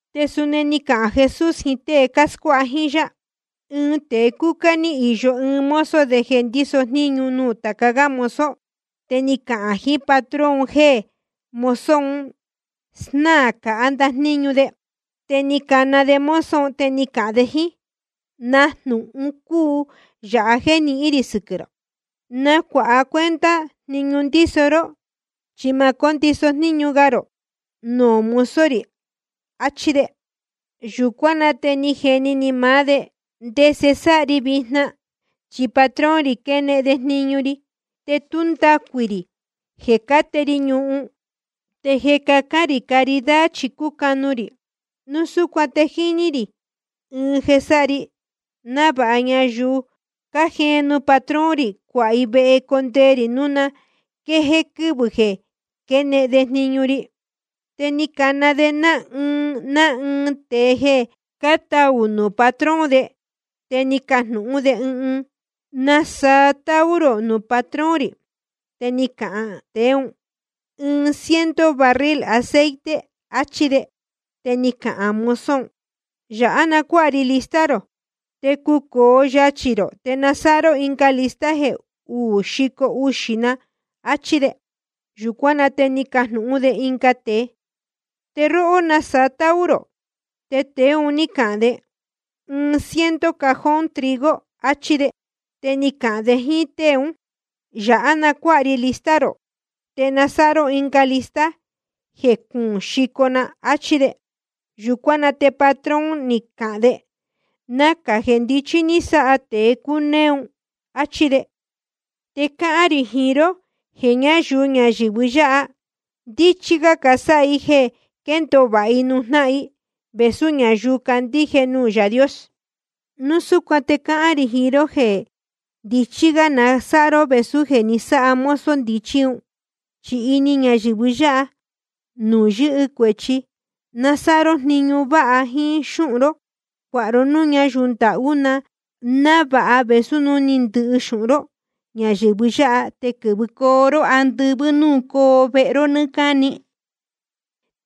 Te suni ni cahān Jesús jiín tée cáscuáha jíín yá: Ɨɨn tēe cúcá ní īyo ɨɨn mozo de jeē ndíso jníñu nuū tāca gá mozo. Te ni cacahān jiín patrón un jéē mozo un snáā cāhá ndajníñu de. Te ni cana de mozo un, te ni cahān de jíín: ¿Na jnūhun cúu yāha jéē nihín rī sɨquɨ̄ rō? Nacuāha cuenta jniñu ndíso ró, chi ma cóndiso jníñu ga rō nuū mozo rī. Achí de. Yūcuán na te jéni ni maá de: ¿Ndese sáha ri vijna? Chi patrón rī quenehen de jniñu ri. Te tú ndacuī rī jeē cáte ri ñuhun, te jeē cacán rī caridad chi cúcanu rī. Núu súcuan te jíní rī ɨɨn jeē sáha ri, návāha ñayuu cájeen nuū patrón rī, cuāha i vehe condee rī núu na quée quɨvɨ̄ jeē quénehen de jniñu ri. Te ni cana de ná ɨɨn ná ɨɨn tēe jeē cátaū nuū patrón de. Te ni cajnūhún de ɨɨn: ¿Nasaa táú rō nuū patrón rī? Te ni cahān tēe ún: Ɨɨn ciento barril aceite, achí de. Te ni cahān mozo un: Yāhá na cuáha ri lista rō, te cucōo yachī rō, te na sáha ró ɨnga lista jeē uú xico uxī na, achí de. Yūcuán na te ni cajnūhún de ɨnga tēe: Te róhó, ¿nasaa táú rō? Te tēe un ní cahān de: Ɨɨn ciento cajón trigo, achí de. Te ni cahān de jíín tée ún: Yāhá na cuáha ri lista rō, te na sáha ró ɨnga lista jeē cuún xico na, áchí de. Yūcuán na te patrón ni cahān de: Nacā jeē ndichí ní sáha tēe cúnéé un, áchí de. Te cáhán rī jiín ró jeē ñáyuu ñayɨ̄vɨ yáha, ndíchí gá casáha i jeē quendōo vāha i nuū jnáhan i, vēsú ñayuu cácandíje nuū Yaā Dios. ’Núu súcuan te cáhán rī jiín ró jeē ndichí gá na sáha ró vēsú jeē ni sáha mozo ndichí un. Chi ini ñayɨ̄vɨ yáha nuū yɨ́hɨ cuēchi, na sáha ró jniñu váha jíín xúhun ró, cuāha ró núū ñáyuu ndahú, návāha vēsú núu ni ndɨhɨ xūhun ró ñayɨ̄vɨ yáha, te quɨ̄vɨcoo ró andɨvɨ́ núū coo vehe ró nɨ́ɨ́ cáni.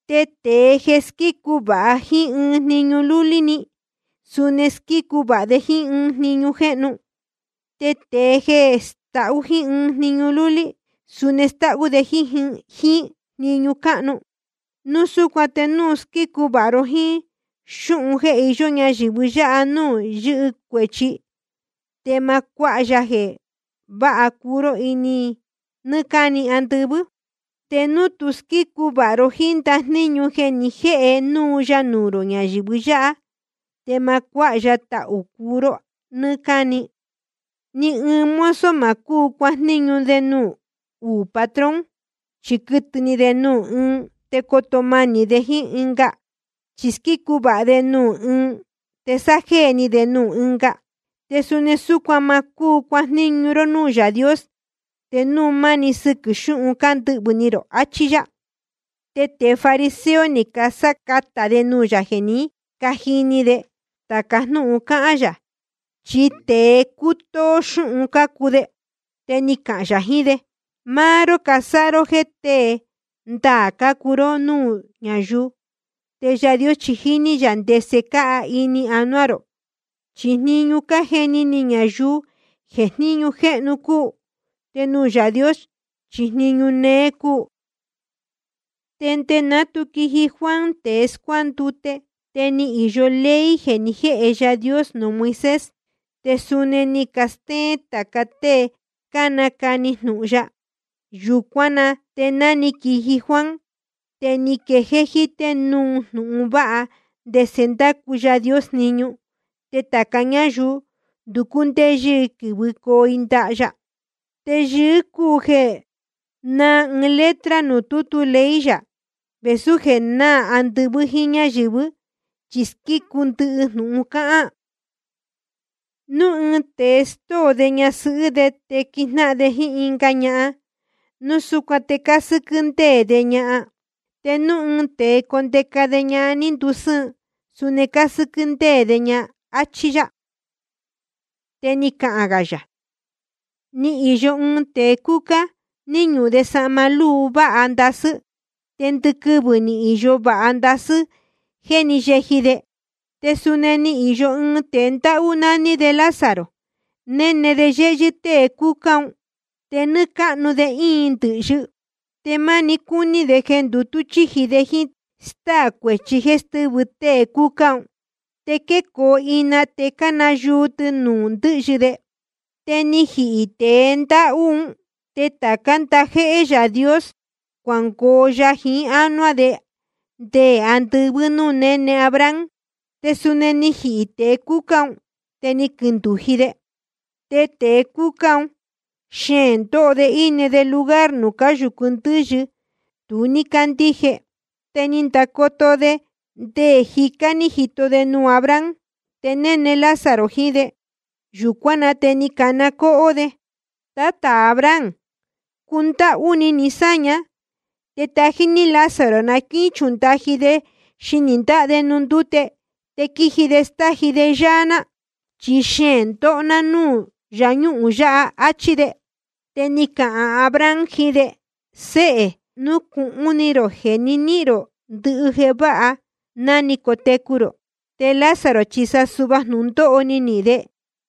’Tēe jeē squícu vāha jíín ɨɨn jniñu lúlí‑ni, suni squícu vāha de jíín jniñu cáhnu. Te tēe jeē stahú jíín ɨɨn jniñu lúlí‑ni, suni stáhú de jíín jniñu cáhnu. Núu súcuan te núu tu squícu vāha ró jíín xúhun jeē iyó ñayɨ̄vɨ yáha nuū yɨ́hɨ cuēchi, te ma cuáha ya jeē váha cuu ró nɨ́ɨ́ cáni andɨvɨ́. Te núu tu squícu vāha ró jíín ndajníñu jeē ni jéhe núu ya nuū rō ñayɨ̄vɨ yáha, te ma cuáha ya tahū cuu ró nɨ́ɨ́ cáni. ’Ni ɨɨn mozo ma cúu cuajníñu de nuū uū patrón. Chi quɨtɨ̄ ni de nuū ɨɨn te coo manī de jíín ɨnga, chí squícu vāha de nuū ɨɨn te sájéē ni de nuū ɨnga. Te suni súcuan ma cúu cuajníñu ró núū Yaā Dios te núu máni sɨquɨ̄ xúhun ndɨ́hvɨ́ ni rō, achí yá. Te tēe fariseo ni casácatā de nuū yā jeē ní cajini de tāca jnúhun cáhán yā, chi tēe cútóó xúhun cácuu de. Te ni cahān yā jiín de: Máá ró cásáha ró jéē tée ndaā cácuu ró núū ñáyuu. Te Yaā Dios chi jíní yā ndese cáa ini anuá rō. Chi jniñu cájeni ni ñayuu jeē jníñu jéhnu cúu, te nuū Yaā Dios chi jniñu néé cúu. ’Nde ná tu quiji Juan tēe scuándute, te ni īyo ley jeē ni jéhe Yaā Dios nuū Moisés, te suni ni castéén tāca tée cánacani jnūhun ya. Yūcuán na te ná ni quiji Juan, te ni quejéé jítē núu jnūhun vāha ndese ndácu Yaā Dios jniñu. Te tāca ñáyuu nducú ndéyɨ́ i quɨ́vɨcoo i ndaha ya. ’Te yɨɨ́ gá cúu jeē náā ɨɨn letra nuū tútu ley yā vēsú jeē náā andɨvɨ́ jíín ñáyɨ̄vɨ́, chi squícu ndɨhɨ jnūhun cáhán. ’Núu ɨɨn tēe stóo de ñasɨhɨ́ de te quijnáhan de jíín ɨnga ñahan, núu súcuan te cásɨ́quɨ́ ndéē de ña. Te núu ɨɨn tēe condeca de ñahan ní ndusɨ́ɨn, suni cásɨ́quɨ́ ndéē de ña, áchí yá. Te ni cahān gā yā: Ni īyo ɨɨn tēe cúcá, ní ñuhun de sahma lúu váha ndasɨ́. Te ndɨquɨvɨ̄ ni īyo vāha ndasɨ́ jéē ní yeji de. Te suni ni īyo ɨɨn tēe ndáhú, nání de Lázaro, néne de yéhyɨ́ tée cúcá un, te nɨ́ɨ́ cáhnu de íin ndɨ̄hyɨ. Te máni cúní de jeē ndutú chíji de jíín stáā cuēchi jeē stɨ́vɨ tēe cúcá un. Te quécoo ina te cánayuu tɨ nuū ndɨ́hyɨ de. Te ni jihī tēe ndáhú un, te tācá ndajéhé Yaā Dios cuangoo ya jiín ánuá de nde andɨvɨ́ nuū néne Abraham. Te suni ni jihī tēe cúcá un, te ni quindūji de. Te tēe cúcá un xeēn ndóho de íne de lugar nuū cáyūcu ndɨ́yɨ tu ní cándíje. Te ni ndacoto de, te nde jicá ní jito de nuū Abraham, te néne Lázaro jiín de. Yūcuán na te ni cana cóhó de: Tátā Abraham, cundáhú ni ni sáña, te tají ní Lázaro, na quíchundaji de xinī ndáha de nuū ndúte, te quiji de stáji de yáá ná. Chi xeēn ndóho ná núū yáñuhūn yāhá. Achí de. Te ni cahān Abraham jiín de: Séhē, nucūhun ni rō jeē ni níhīn rō ndɨhɨ jeē váha ná ni cotecu rō, te Lázaro chi sa suhva jnūndóho ni nihīn de.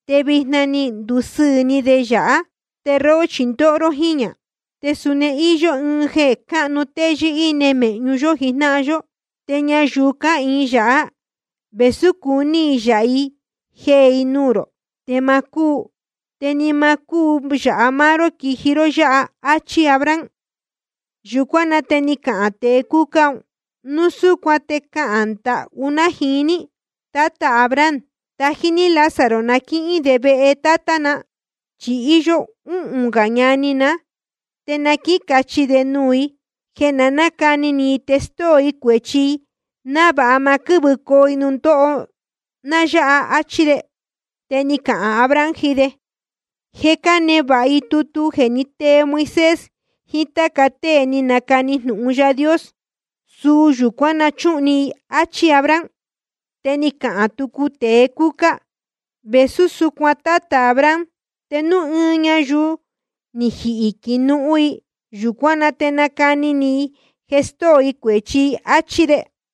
Te vijna je ni ndusɨɨ̄ ni de yāhá, te róhó chi ndóho ró jíñā. Te suni íyó ɨɨn jeē cunú téyɨ́, íne mēhñu yó jijnáhan yó. Te ñayuu cáhīin yāhá, vēsú cácuni i yāha i jeē i nuū rō, te ma cúu. Te ni ma cúu yāha máá ró quijicoo ró yáha. Achí Abraham. Yūcuán na te ni cahān tēe cúcá: Núu súcuan te cáhán ndahú ná jiín ní, Tátā Abraham, tají ní Lázaro na quíhín de vehe tátá na. Chi íyó úhūn gā ñani ná, te na quícachi de nuū i jeē na nácani ni i te stóo i cuēchi i, návāha ma quɨ́vɨcoo i nuū ndóho ná yáha, áchí de. Te ni cahān Abraham jiín de: Je cánevāha i tutu jeē ní tee Moisés jiín táca tée ni canacani jnūhun Yaā Dios. Suu yūcuán na chúhun ni i, áchí Abraham. Te ni cahān tucu tēe cúcá: Vēsú súcuan, Tátā Abraham, te núu ɨɨn ñayuu ni jihī quihīn nuū i, yūcuán na te nacani ni i jeē stóo i cuēchi i, áchí de.